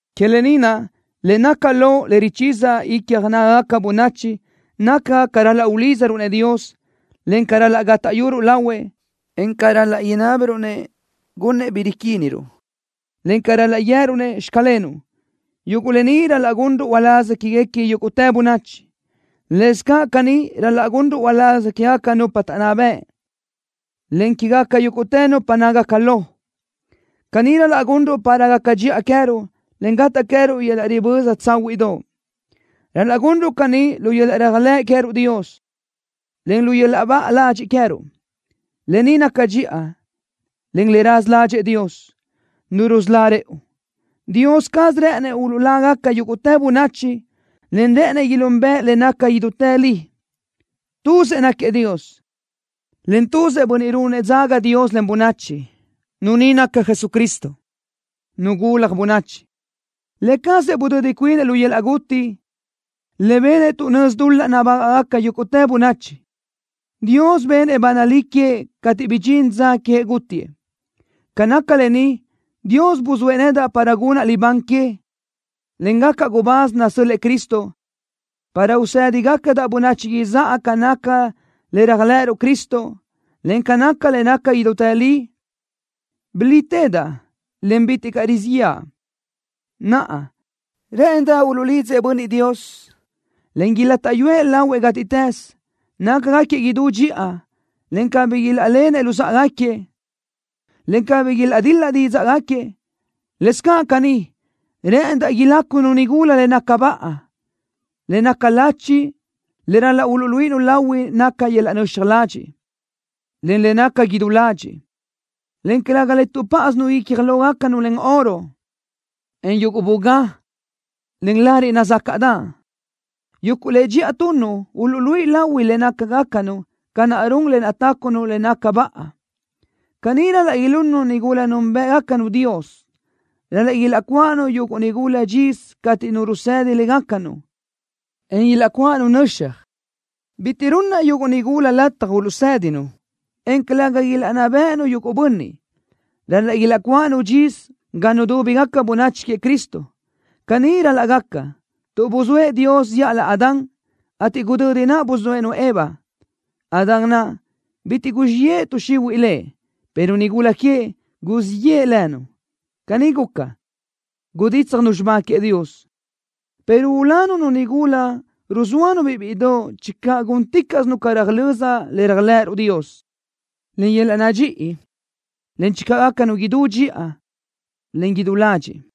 Que lë ni naʼ le naca lo le richíziaʼ icja nágagaca bönachi naca ca ral-laʼ ulídzaruʼ-nëʼ Dios, en ca ral-laʼ gátaʼyuruʼ lahuëʼ, en ca ral-laʼ inábiruʼ-nëʼ gunnëʼ bi riquíniruʼ, en ca ral-laʼ guië́ruʼ-nëʼ: “Xclenuʼ.” Yuguʼ lë ni ral-laʼ gunruʼ uláz quéguequi yúguʼtë bönachi. Lëscaʼ caní ral-laʼ gunruʼ uláz quégaca nupa taʼnná bëʼ, en quégaca yúguʼtë nupa nácagaca lo. Caní ral-laʼ gunruʼ para gaca dxiʼa queë́ruʼ, en gataʼ queë́ruʼ yöl-laʼ riböza tsáhuiʼdoʼ. Ral-laʼ gunruʼ caní lu yöl-laʼ réajlëʼ queë́ruʼ Dios, en lu yöl-laʼ baʼa ladxiʼ queë́ruʼ. Lë ni naca dxiʼa, en le raza ládxëʼë Dios, Nu rusölá rëʼu. Dios caz rë́ʼënëʼ uluʼlágaca yúguʼtë bönachi, en rë́ʼënëʼ ilúnbëʼe le naca idútë li. Tuzëʼ náquiëʼ Dios, en tuzëʼ bönniʼ ruúnëʼ dzaga Dios, en bönachi. Nu ni naca Jesucristo, Nu gulaj bönachi. Lë cazëʼ budödi cuinëʼ lu yöl-laʼ guti, le benëʼ tuʼ nözi dul-laʼ nabágaʼgaca yúguʼtë bönachi. Dios benëʼ ba nalí queëʼ cateʼ bidxín dza queëʼ gútiëʼ. Ca naca lë ni, Dios buzóëʼ nedaʼ para gunaʼ libán que, en gacaʼ gubáz nasö́l-lëʼë Cristo, para usédigacadaʼ bönachi izáʼa ca naca le réajlëʼëruʼ Cristo, en ca naca le naca idútë li. Rilítedaʼ, en bitiʼ caʼ rizíʼ yëʼa. Naʼa, rë́ʼëndaʼ uluʼlidzëʼ bönniʼ Dios, en ilátaʼyuëʼ lahuëʼ gátiʼtës, nácagaquiëʼ idú dxiʼa, en cabí ilaʼlenëʼ luzáʼagaquiëʼ, en cabí ilaʼdil-la dídzaʼgaquiëʼ. Lëscaʼ caní, rë́ʼëndaʼ ilácunu nigula le naca baʼa. Le naca lachi le ral-laʼ uluʼluíʼinu lahui naca yöl-laʼ nöxaj ladxiʼ, en le naca idú ladxiʼ, en calëga le tuʼpáʼasinu icja lógacanu len oro, en yuguʼ bugá, en lariʼ nazácaʼdaʼ. Yuguʼ le dxiʼa tunnu uluʼluíʼi lahui le nácagacanu ca naʼ run le tácunu le naca baʼa. Caní ral-laʼ ilunnu nigula núnbëʼgacanu Dios. Ral-laʼ ilaʼcuáʼanu yuguʼ nigula dxisö cateʼ nu rusedi légacanu, en ilaʼcuáʼanu nöxaj. Bitiʼ runnaʼ yuguʼ nigula lataj uluʼsédinu, en calëga ilaʼnná béʼenu yuguʼ bönniʼ. Ral-laʼ ilaʼcuáʼanu dxisö ga nudúbigaca bönachi queëʼ Cristo. Caní ral-laʼ gaca, tuʼ buzóëʼ Dios zíʼalö Adán, ateʼ gudödi naʼ buzóëʼ-nu Eva. Adán naʼ, bitiʼ guzxíʼ yeʼe tuʼ xihuiʼ lëʼ, pero nigula queëʼ, guzxíʼ yeʼe lënu. Caní guca, gudítsjanu xibá queëʼ Dios, pero ulanu nu nigula ruzóanu-biʼ bíʼidoʼ channö gúnticaʼsinu ca röjlö́z le réajlëʼëruʼ Dios, en yöl-laʼ nadxíʼi, en channö gácanu idú dxiʼa, en idú ladxiʼ.